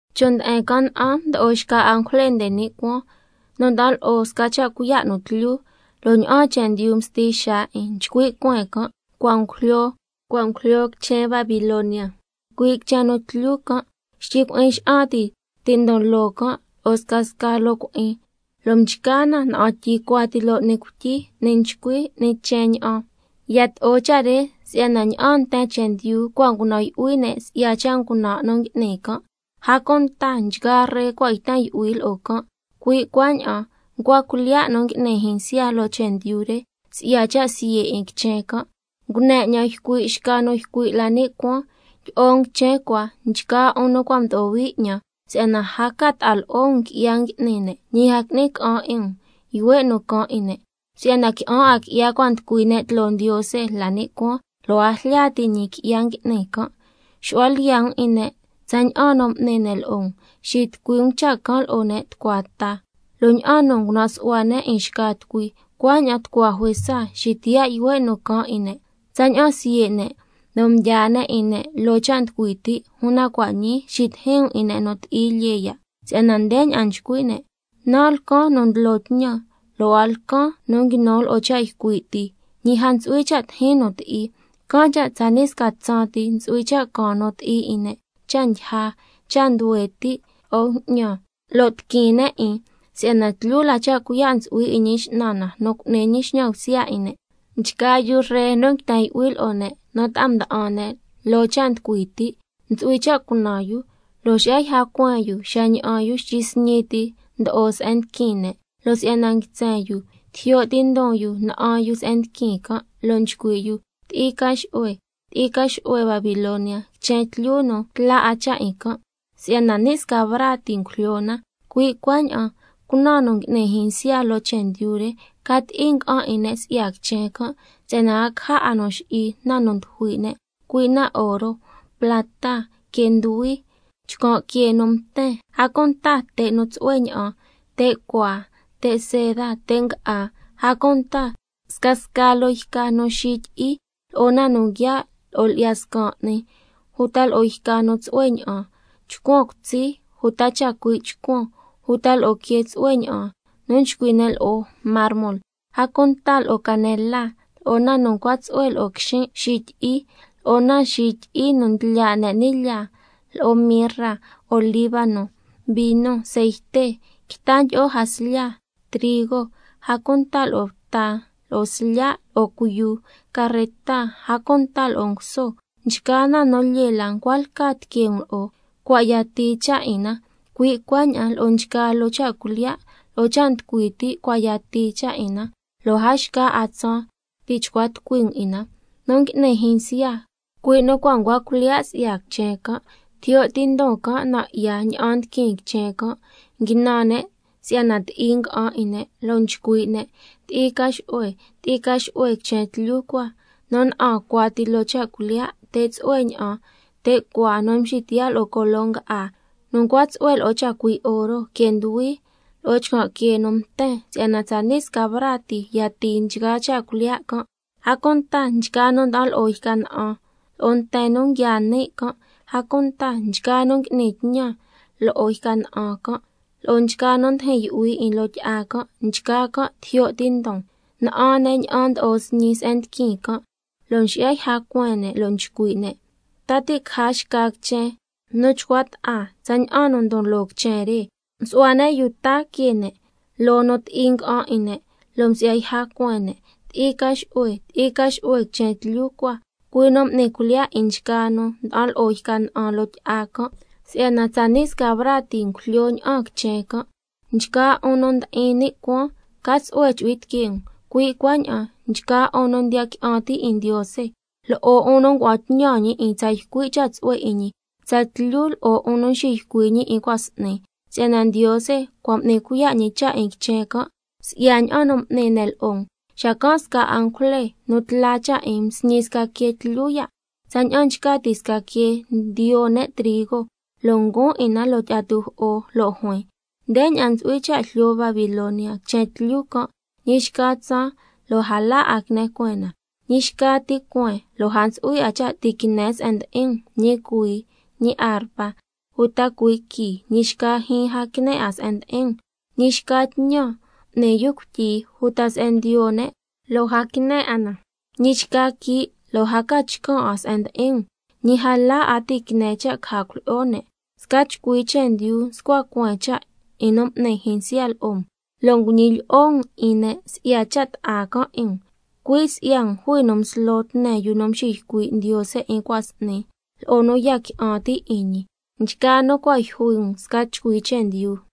Chon' nde'en can' na'an mdo'o xca angujle nde ni' cuaan nu nda'an lo'o sca cha' cuiya' nu tlyu, lo' ña'aan chendyu msti xaa 'in. Nchcui' cueen can': —Cua' ngujlyo, cua' ngujlyo quichen Babilonia, cui' quichen nu tlyu can'—, xtyi cui'in xa'an ti ndon loo can' lo'o scasca loo cui'in, lo' mchca na na'an tyi cuati loo 'ni cuityi, 'ni nchcui, 'ni chen ña'an. Yato'o cha' re si'yana ña'aan nten chendyu cua' ngunan' yu'hui ne' si'ya cha' ngunan' nu ngui'ni can', a cunta nchgaa ree cua' yten yu'hui lo'o can', cui' cuaña'an ncua cuilyiya' nu ngui'ni jyinsya loo chendyu re, si'ya cha' siye' 'in quichen can'. Ngune 'ñan ycui' xca nu ycui' la ni' cuaan: Tyi'o um quichen cua, nchgaa 'un nu cua' mdo'o hui 'ñan, si'yana a ca ta'a lo'o um qui'ya ngui'ni ne', ñi a qui'ni ca'an 'in um yuhue' nu caan 'in ne'. Si'yana qui'an 'a qui'ya cua' nducui ne' tloo Ndiose la ni' cuaan, lo' a njlya ti' ñi qui'ya ngui'ni can'. Xu'hua lyiya' um 'in ne' tsaña'an nu m'ni ne' lo'o um, xitucui um cha' can' lo'o ne' tucua ta, lo' ña'an nu ngunan' su'hua ne' 'in xca tucui, cuaña'an tucua juesa xitiyaa' yuhue' nu caan 'in ne'. Tsaña'an siye' ne' lo' mdyaa ne' 'in ne' loo cha' nducui ti', una cua' ñii xitijin um 'in ne' nu ti'i lyee ya', si'yana ndeña'an nchcui' ne': Nan' lcan nu ndlo tñan, lo' a lcan nu nguinu lo'o cha' ycui' ti, ñi a ntsu'hui cha' tijin nu ti'i. Can' cha' tsani' sca tsaan ti ntsu'hui cha' caan nu ti'i 'in ne', cha' ndyija, cha' nduhue ti', lo'o bju'ñan, lo' tiquin ne' 'in, si'yana tlyu la cha' cuiya' 'in Ñi X'nan na nu cu'ni ñi xñan bsya 'in ne'. Nchgaa yu ree nu nguiten yu'hui lo'o ne' nu ta'a mda'an ne' loo cha' nducui ti', ntsu'hui cha' cunan yu, lo' xi'ya yja cueen yu xa ña'an yu xtyi sñi ti ndo'o se'en ndiquin ne', lo' si'yana nguitsen yu, can' cha' tijyo' ti' ndon yu na'an yu se'en ndiquin can', lo' nchcui' yu: Ti'i ca xu'hue, ti'i ca xu'hue Babilonia, quichen tlyu nu tla 'a cha' 'in can', si'yana ni' sca braa ti ngujlyo na. Cui' cuaña'an cunan nchgaa nu ngui'ni jyinsya loo chendyu re, ca ti'i nga'an 'in ne' si'ya quichen can', si'yana a caja 'a nu xi'i na nu ndyujui' ne', cui' na oro, plata, quee nduhui, chcan' quee nu mten, a cunta te' nu tsu'hue ña'an, te' cuaa, te' seda, te' nga'á, a cunta scasca loo yca nu xityi'i, lo'o na nu nguiaa' lo'o lyi'ya scan 'ni, uta lo'o yca nu tsu'hue ña'an, chcuan cutsi, uta chacui' chcuan, uta lo'o quee tsu'hue ña'an nu nchcui' ne' lo'o mármol, a cunta lo'o canela, lo'o na nu ncua tsu'hue lo'o quixin' xityi'i, lo'o na xityi'i nu ndlya' ne' ni' lyaa, lo'o mirra, olíbano, vino, ceite, quita ndyi'o jaslya, trigo, a cunta lo'o bta lo'o slya', lo'o cuiyu, carreta, a cunta lo'o nguso. Nchgaa na nu lyee la ncua lca tiquee um lo'o, cua' yatii cha' 'in na, cui' cuaña'an lo'o nchgaa loo cha' cuilyiya' lo'o cha' nducui ti' cua' yatii cha' 'in na, lo' a xca 'a tsaan ti' chcua tucui um 'in na. Nu ngui'ni jyinsya, cui' nu cua' ncua cuilyiya' si'ya quichen can', tijyo' ti ndon can' nan' 'ya ña'an ndiquin quichen can', nguinan ne' si'yana ti'i nga'an 'in ne'. Lo' nchcui' ne': Ti'i ca xu'hue, ti'i ca xu'hue quichen tlyu cua, nu na'an cuati loo cha' cuilyiya', te' tsu'hue ña'an, te' cuaa nu mxitiyaa' lo'o colo nga'á, nu ncua tsu'hue lo'o chacui' oro, quee nduhui, lo'o chcan' quee nu mten. Si'yana tsani' sca braa ti yatii nchgaa cha' cuilyiya' can'. A cunta nchgaa nu nda'an lo'o yca na'an, lo'o nten nu nguiaa ni' can', a cunta nchgaa nu ngui'ni tñan lo'o yca na'an can', lo'o nchgaa nu ndijin yu'hui 'in loo tyi'a can', nchgaa can' tijyo' ti ndon, na'an ne' ña'an ndo'o sñi se'en ndiquin can', lo' msi'ya yja cueen ne', lo' nchcui' ne': ¿Ta ti' caja xca quichen nu chcua ta'a tsaña'an nu ndon loo quichen re? Msu'hua ne' yuu ta que ne' loo nu ti'i nga'an 'in ne', lo' msi'ya yja cueen ne': Ti'i ca xu'hue, ti'i ca xu'hue quichen tlyu cua, cui' nu m'ni cuilyiya' 'in nchgaa nu nda'an lo'o yca na'an loo tyi'a can', si'yana tsani' sca braa ti ngujlyo ña'aan quichen can'. Nchgaa 'un nu ndi'in ni' cuaan, ca tsu'hue chu'hui tiquee um, cui' cuaña'an nchgaa 'un nu ndiya qui'an ti' 'in Ndiose, lo'o 'un nu ngua'an tñan ñi 'in tsa ycui' cha' tsu'hue 'in ñi, tsatlyu lo'o 'un nu mxiycui' ñi 'in cua' s'ni, si'yana Ndiose cua' m'ni cuiya' ñi cha' 'in quichen can', si'ya ña'an nu m'ni ne' lo'o um. Xacan' sca angujle nu tla cha' 'in msñi sca quee tlyu ya', tsaña'an nchca ti' sca quee ndiyo ne' trigo, lo' nguun 'in na loo tyi'a tujo'o, lo' juin: Ndeña'an ntsu'hui cha' jlyo Babilonia, quichen tlyu can', ñi xca tsaan lo' a la 'a quine cueen na. Ñi xca ti cueen lo' a ntsu'hui 'a cha' ti' quine se'en ndi'in um, ñi cuhuii, ñi arpa, uta cuhuii quii, ñi xca jyiin a quine 'a se'en ndi'in um, ñi xca tñan n'ni yu cuityi, uta se'en ndiyo ne', lo' a quine 'a na. Ñi xca quii' lo' a ca chcan' 'a se'en ndi'in um, ñi a la 'a ti' quine cha' caja cuilyi'o ne'. Sca chcui chendyu mscua cueen cha' 'in nu m'ni jyinsya lo'o um, lo' nguñilyi'o um 'in ne' si'ya cha' bta'a can' 'in um. Cui' si'ya um jui nu mslo tne yu nu mxiycui' Ndiose 'in cua' s'ni, lo'o nu ya qui'an ti' 'in ñi, nchgaa nu cua' yjui um sca chcui chendyu.